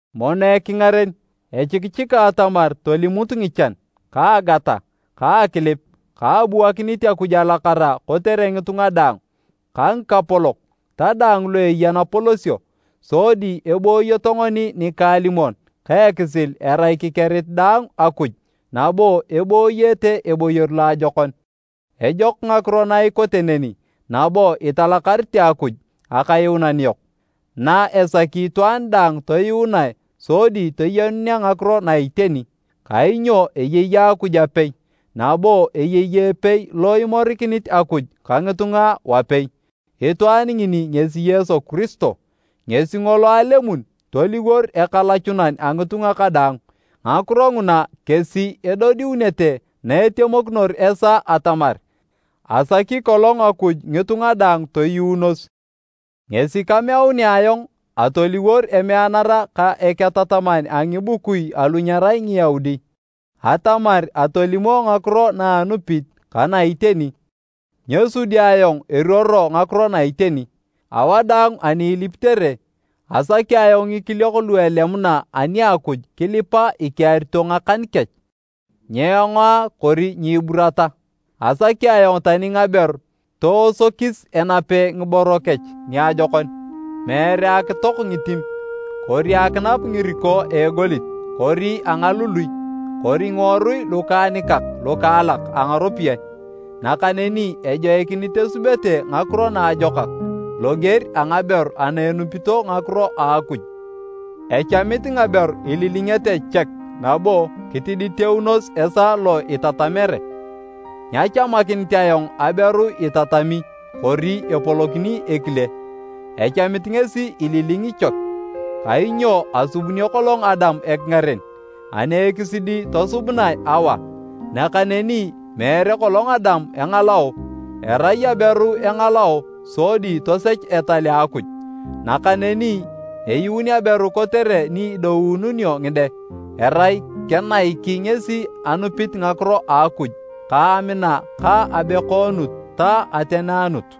Mono ekingaren, echikichika atamar tolimut ngichan, ka agata, ka akilip ka abuakinit Akuj alakara kotere ngitunga daang, ka ngikapolok ta daang lu eya napolosio, sodi eboyoto ngoni nikaalimon ka ekisil erai kikerit daang Akuj nabo ebooyete eboyor loajokon. Ejok ngakiro na ikote neni nabo italakarete Akuj Akayuunan yok, na esaki itwaan daang toyuunae sodi toyenunea ngakiro na iteni. Kainyo eyei Akuj apei, nabo eyei epei lo imorikinit Akuj ka ngitunga wapei, itwaan ngini ngesi Yesu Kiristo, ngesi ngolo alemun toliwor ekalachunan a ngitunga kadaang. Ngakiro nguna kesi edodiunete na etemokinor esaa atamar, asaki kolong Akuj ngitunga daang toyuunos. Ngesi kameunere ayong atoliwor emeanara ka eketataman a ngibukui alu nyerai Ngiyaudi, atamar atolimo ngakiro na anupit ka na iteni. Nyesudi ayong, eruoro ngakiro na iteni! Awadaang ani ilipitere, asaki ayong ngikiliok lu elemuna ani a Akuj kilipa ikearito ngakan kech, nyeengoa kori nyiiburata. Asaki ayong tani ngaberu toosokis enape ngiboro kech niajokon. Meere akitok ngitim kori akinap ngiriko a egolit kori a ngalului kori ngiworui lukaanikak lukaalak a ngaropiyae. Nakaneni ejoikinit esubete ngakiro naajokak loger a ngaberu ana enupito ngakiro a Akuj. Echamit ngaberu ililingete chek nabo kitiditeunos esaa lo itatamere. Nyachamakinit ayong aberu itatami kori epolokini ekile, echamit ngesi ililingi chek. Kainyo asubunio kolong Adam ekingaren ani ekisidi tosubunae Awa. Nakaneni meere kolong Adam engalao, erai aberu engalao sodi tosech etal a Akuj. Nakaneni eyuun aberu kotere ni idoununio ngide, erai kenaiki ngesi anupit ngakiro a Akuj ka amina ka abekoonut ta ateneanut.